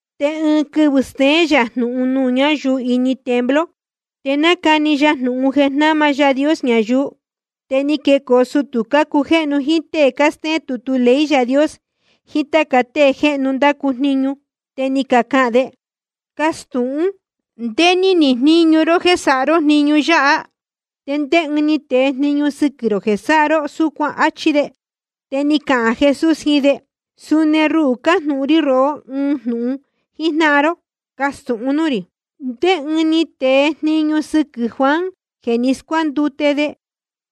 Te ɨɨn quɨvɨ̄ steén yā jnūhun nuū ñáyuu ini templo, te nácani ya jnūhun jeē jnáma Yaā Dios ñayuu. Te ni quecoo sutū cácujéhnu jíín tée cástéén tutu ley Yaā Dios jiín táca tée jéhnu cándacu jniñu. Te ni cacahān de: Castūhún, ¿ndé ní nihīn jníñu ró jéē sáha ró jniñu yáha? ¿Te ndé ɨɨn ni tee jniñu sɨquɨ̄ rō jeē sáha ró súcuan? Achí de. Te ni cahān Jesús jiín de: Suni ruhū cajnūhun rí rohó ɨɨn jnūhun jíjnáhan ró. Castūhun núū rī: ¿Ndé ɨɨn ni tee jniñu sɨquɨ̄ Juan jeē ni scuándute de?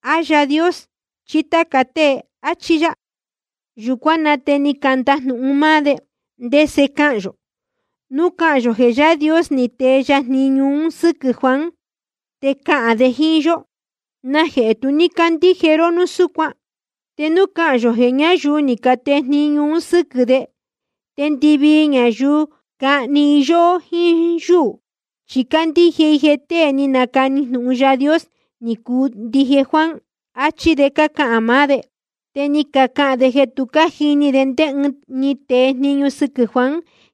¿A Yaā Dios chí táca tée? Achí yá. Yūcuán na te ni candajnūhun máá de: ¿Ndese cahān yō? Núu cahān yō jeē Yaā Dios ni tee ya jniñu un sɨ́quɨ̄ Juan, te cahān de jíín yó: ¿Najehē tu ní cácandíje ró de núu súcuan? Te núu cahān yō jeē ñáyuu ni catee jniñu un sɨ́quɨ̄ de, te ndɨvii ñayuu cahni i yóhó jíín yúū, chi cácandíje i jeē tée ni nacani jnūhun Yaā Dios ni cuu ndije Juan, achí de cácahān maá de. Te ni cacahān de jeē tu cájini de ndé ɨɨn ni tee jniñu sɨquɨ̄ Juan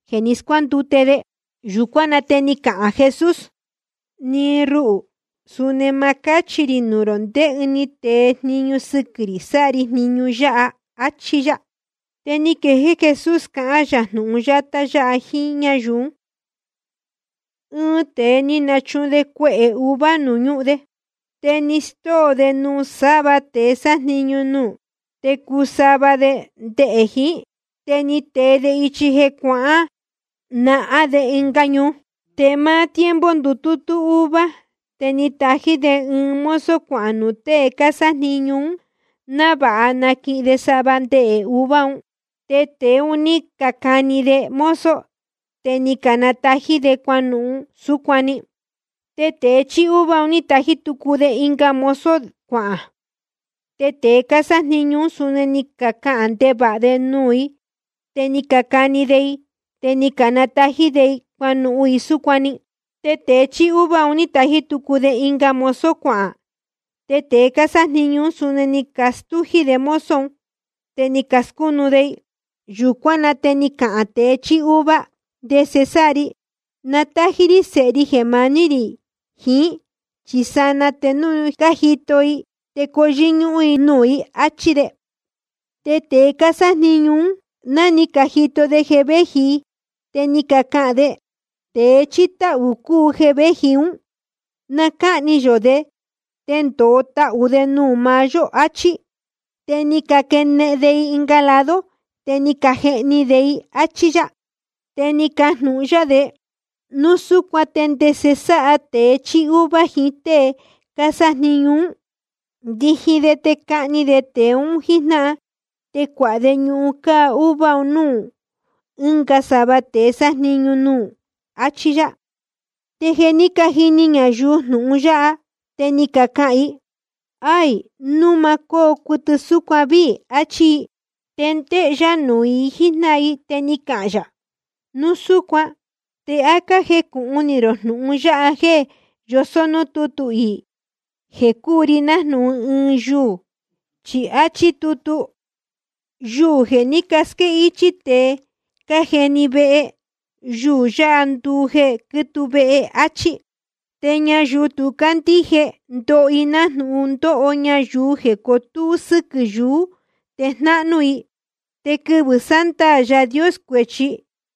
jeē ni scuándute de. Yūcuán na te ni cahān Jesús: Ni ruhū, suni ma cáchi rī nuū rō ndé ɨɨn ni tee jniñu sɨquɨ̄ rī sáha ri jniñu yáha, áchí yá. Te ni quejéé Jesús cahán yā jnūhun yátá yáha jíín ñáyuu ún: Ɨɨn tēe ni nachuhun de cuehē uva nuū ñúhun de. Te ni stóo de nuū sava tēe sájniñu nuū, te cuu sava de ndehē jiín. Te ni tee de ichi jeē cuahān nahán de ɨnga ñuu. Te máá tiempo ndutútú uva, te ni tají de ɨɨn mozo cuahān nuū tée cásájniñu ún, návāha naquihin de sava ndehē uva un. Te tēe un ní cacani de mozo, te ni canatají de i cuanuhun i súcuan‑ni. Te tēe chíí uva ni tají tucu de ɨnga mozo cuahān. Te tēe cásájniñu ún, suni ni cacahān ndevāha de nuū i, te ni cacani de i, te ni canatají de i cuanuhun i súcuan‑ni. Te tēe chíí uva ni tají tucu de ɨnga mozo cuahān. Te tēe cásájniñu ún, suni ni castújí de mozo un, te ni cascúnu de i. ’Yūcuán na te ni cahān tēe chíí uva: ¿Ndese sáha ri? Na tájí rí sēhe ri jeē maní rī jiín, chi sanaa te núu ni cajito de i te coo yɨ́ñúhún de nuū i. Achí de. Te tēe cásájniñu ún, ná ni cajito de jeē véji i, te ni cacahān de: Tēe chíí táhū cúu jeē véji ún. Na cáhni yō de, te ndōo tahū de cuu máá yó, achí. Te ni caquenehen de i ɨnga lado, te ni cajehni de i, áchí yá. Te ni cajnūhun yá de: Núu súcuan ¿te ndese sáha tēe chíí uva jiín tée cásájniñu ún? Ndiji de te cahni de tēe un jíjnáhan, te cuāha de ñuhun cáá uva un núū ɨnga sava tēe sájniñu nuū, achí yá. Te jeē ní cajini ñayuu jnūhun yáha, te ni cacahān i: Aī, núu ma cóo cuɨtɨ súcuan víī, achí i. Te ndéhé yá nuū i jíjnáhan i, te ni cahān yā: Núu súcuan ¿te á cájecūhun ni rō jnūhun yáha jéē yosó núū tútu iī jeē cúu ri nájnūhun ɨɨn yuū? Chi áchí tutu: Yuū jeē ní casquéhichī tēe cájeni vehe, yuū yáha nduu jeē quítuu vehe. Achí. Te ñayuu tu cácandíje, ndoho i nájnūhun ndóho ñayuu jeē cotúú sɨquɨ̄ yuú te jnáhnú i. Te quɨvɨ̄ sándaā Yaā Dios cuēchi,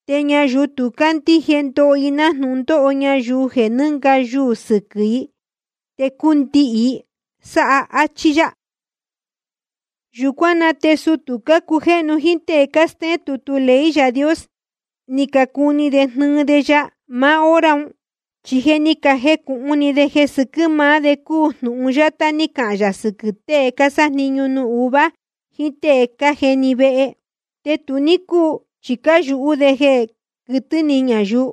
te ñayuu tu cácandíje, ndoho i nájnūhun ndóho ñayuu jeē nɨ́nga yuū sɨquɨ̄ i te cundihī i sáha. Achí yá. Yūcuán na te sutū cácujéhnu jíín tée cástéén tutu ley Yaā Dios, ni cacuni de jnɨɨ de ya maá hora un. Chi ni cajecūhun ni de jeē sɨquɨ̄ maá de cúu jnūhun yátá ní cahān yā sɨquɨ̄ tée cásájniñu nuū uva jiín tée cájeni vehe. Te tu ní cúu, chi cáyūhú de jeē quɨtɨ̄ ni ñayuu.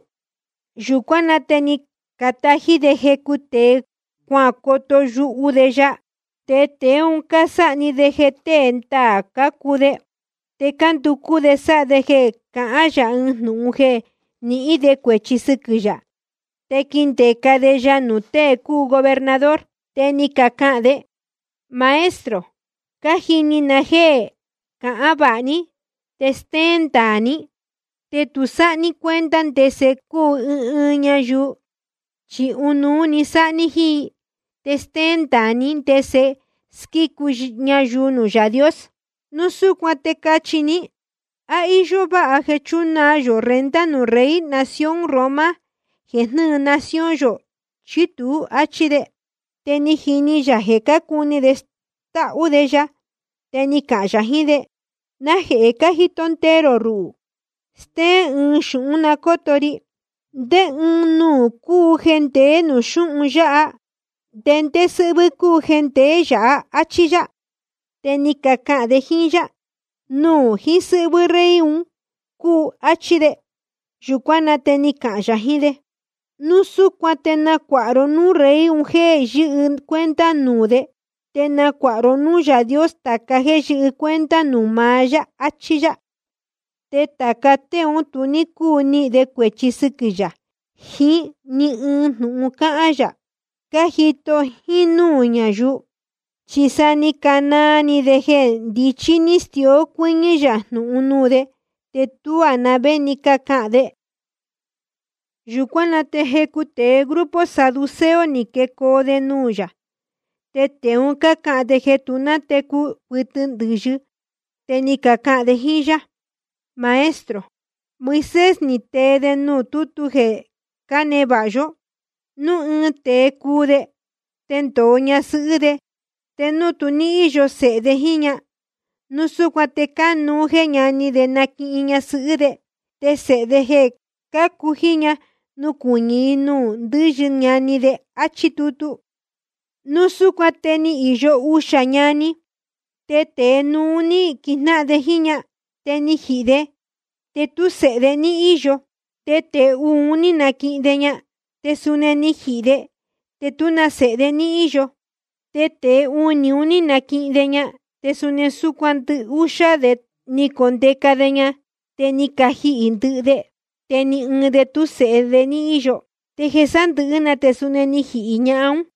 Yūcuán na te ni catají de jecu tēe cuacoto yuhu de ya, te tēe un cásáha‑ni de jeē tée ndaā cácuu de. Te cánducú de sáha de jeē cahán yā ɨɨn jnūhun jeē nihín de cuēchi sɨquɨ̄ yā, te quindeca de ya nuū tēe cúu gobernador. Te ni cacahān de: Maestro, cájini na jéē cahán vāha ní, te stéén ndaā ní. Te tu sáha ní cuenta ndese cúu ɨɨn ɨɨn ñayuu, chi ɨnuú‑ni sáha ní jíín i. Te stéén ndaā ní ndese squícu ñayuu nuū Yaā Dios. Núu súcuan te cachi ní: ¿A íyó váha jeē chúnaa yō renta nuū rey nación Roma jeē jnɨ́ɨ nación yō, chí tuú? áchí de. Te ni jini yā jeē cácuni de stáhú de ya, te ni cahān yā jiín de: ¿Najehē cájito ndee rō ruhū? Stéén ɨɨn xūhún na cóto ri. ¿Ndé ɨɨn nuū cúu jeē ndeé nuū xúhun yáha, te ndé sɨ́hvɨ́ cúu jeē ndeé yāhá? áchí yá. Te ni cacahān de jíín yá: Nuū jiín sɨ́hvɨ́ rey un cúu, áchí de. Yūcuán na te ni cahān yā jiín de: Núu súcuan te nacuāha ró núū rey un jéē yɨ́hɨ cuenta nuū de, te nacuāha ró núū Yaā Dios tāca jéē yɨ́hɨ cuenta nuū maá yá, achí yá. Te tāca tée ún tu ní cúu nihīn de cuēchi sɨquɨ̄ yā jiín ni ɨɨn jnūhun cáhán yā, cájito jínúū ñayuu. Chi sa ni canaa ni de jeē ndichí ní stió cuɨ́ñɨ́ yā jnūhun nuū de, te tuá na vé ni cácahān de. Yūcuán na te jecu tēe grupo saduceo ni quecoo de nuū yā. Te tēe un cácahān jeē tu nátecu cuɨtɨ ndɨ̄yɨ. Te ni cacahān de jíín yá: Maestro, Moisés ni tee de nuū tútu jeē cánevāha yó: Núu ɨɨn tēe cuu de, te ndōo ñasɨhɨ́ de, te núu tu ní íyo sēhe de jíín ña, núu súcuan te cánuú jeē ñani de naquihin ñasɨhɨ́ de, te sēhe de jeē cácu jíín ña nucuɨñɨ̄ i nuū ndɨ́yɨ ñani de, áchí tutu. Núu súcuan te ni īyo uxā ñani. Te tēe núú ní quijnáhan de jíín ñahan. Te ni jihī de, te tú sēhe de ní íyo. Te tēe uū ni naquihin de ña, te suni ni jihī de, te tú na sēhe de ní íyo. Te tēe unī ni naquihin de ña. Te suni súcuan ndɨhúxá de ni condeca de ña, te ni cajihī ndɨhɨ de, te ni ɨɨn de tú sēhe de ní íyo. Te jeē sándɨ̄hɨ́ te suni ni jihī ñahan ún.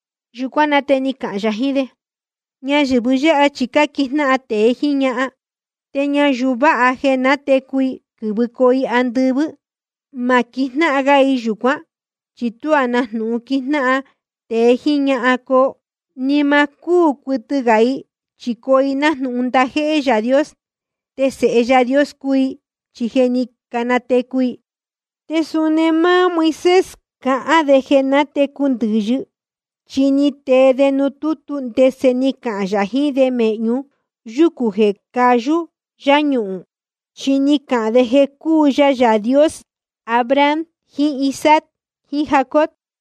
Yūcuán na te ni cahān yā jiín de: Ñayɨ̄vɨ yáha chi cáquijnáhan tēe jíín ñahan. Te ñayuu vāha jeē natecu i quɨ̄vɨcoo i andɨvɨ́, ma quijnáhan ga i yūcuán, chi tuá na jnūhun quijnáhan tēe jíín ñahan coo. Ni ma cúū cuɨtɨ gā i, chi coo i nájnūhun ndajéhé Yaā Dios. Te sēhe Yaā Dios cuu i, chi je ni canatecu i. Te suni máá Moisés cáhán de jeē nátecu ndɨ̄yɨ, chi ni tee de nuū tútu ndese ni cahān yā jiín de mēhñu yúcū jeē cayú yáñuhūn. Chi ni cahān de jeē cúu ya Yaā Dios Abraham jiín Isaac jiín Jacob.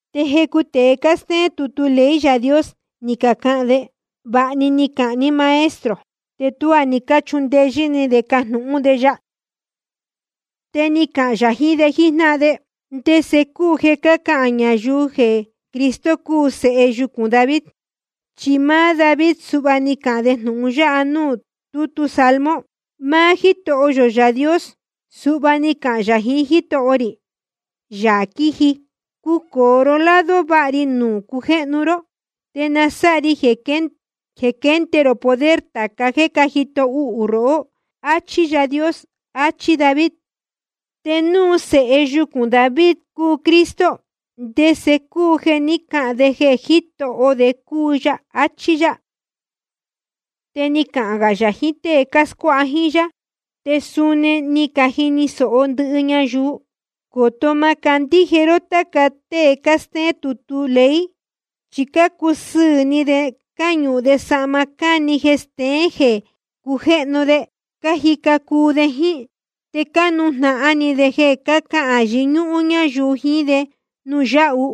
Te jecu tēe cástéén tutu ley Yaā Dios ni cacahān de: Vāha ni cahān ní Maestro. Te tuá ni cáchundeyɨ́ ni de cajnūhún de ya. Te ni cahān yā jiín de jíjnáhan de: ¿Ndese cúu jeē cácahān ñayuu jeē Cristo cúu sēhe yucūn David? Chi máá David suhva ni cahān de jnūhun ya nuū tútu Salmo: Máá Jítoho yō Yaā Dios suhva ni cahān yā jiín Jítoho rī, Yaā quiji: Cucōo ró lado váha ri nuū cujéhnu ró, te na sáha ri jeē quende rō poder tāca jéē cájito uhū rohó. Achí Yaā Dios. Achí David. Te núu sēhe yucūn David cúu Cristo, ¿te ndese cúu jeē ni cáhān de jeē Jítoho de cúu ya? áchí yá. Te ni cahān yā jiín tée cáscuáha jíín yá, te suni ni cajini sōho ndɨhɨ ñayuu: Coto má cándíje ró táca tée cástéén tutu ley. Chi cácusɨɨ̄ ni de cáñuhun de sahma cáni jeē steén jeē cujéhnu de, cájica cuu de jíín. Te cánujnahan ni de jeē cahán yɨñúhún ñáyuu jiín de nuū yáhu.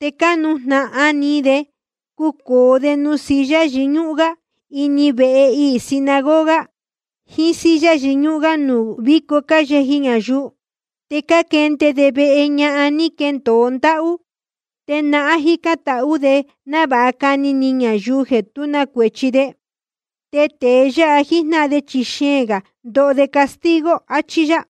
Te cánujnahan ni de cucōo de nuū silla yɨñúhún gá ini vehe iī sinagoga, jiín silla yɨñúhún gá nuū víco cáyeji ñayuu. Te cáquende de vehe ñahan ní caquendōo ndáhú. Te nahán cájicān tahú de návāha cani ni ñayuu jeē tú na cuēchi de. Tēe yáha jíjnáhan de chi xeēn gā ndoho de castigo. Achí yá.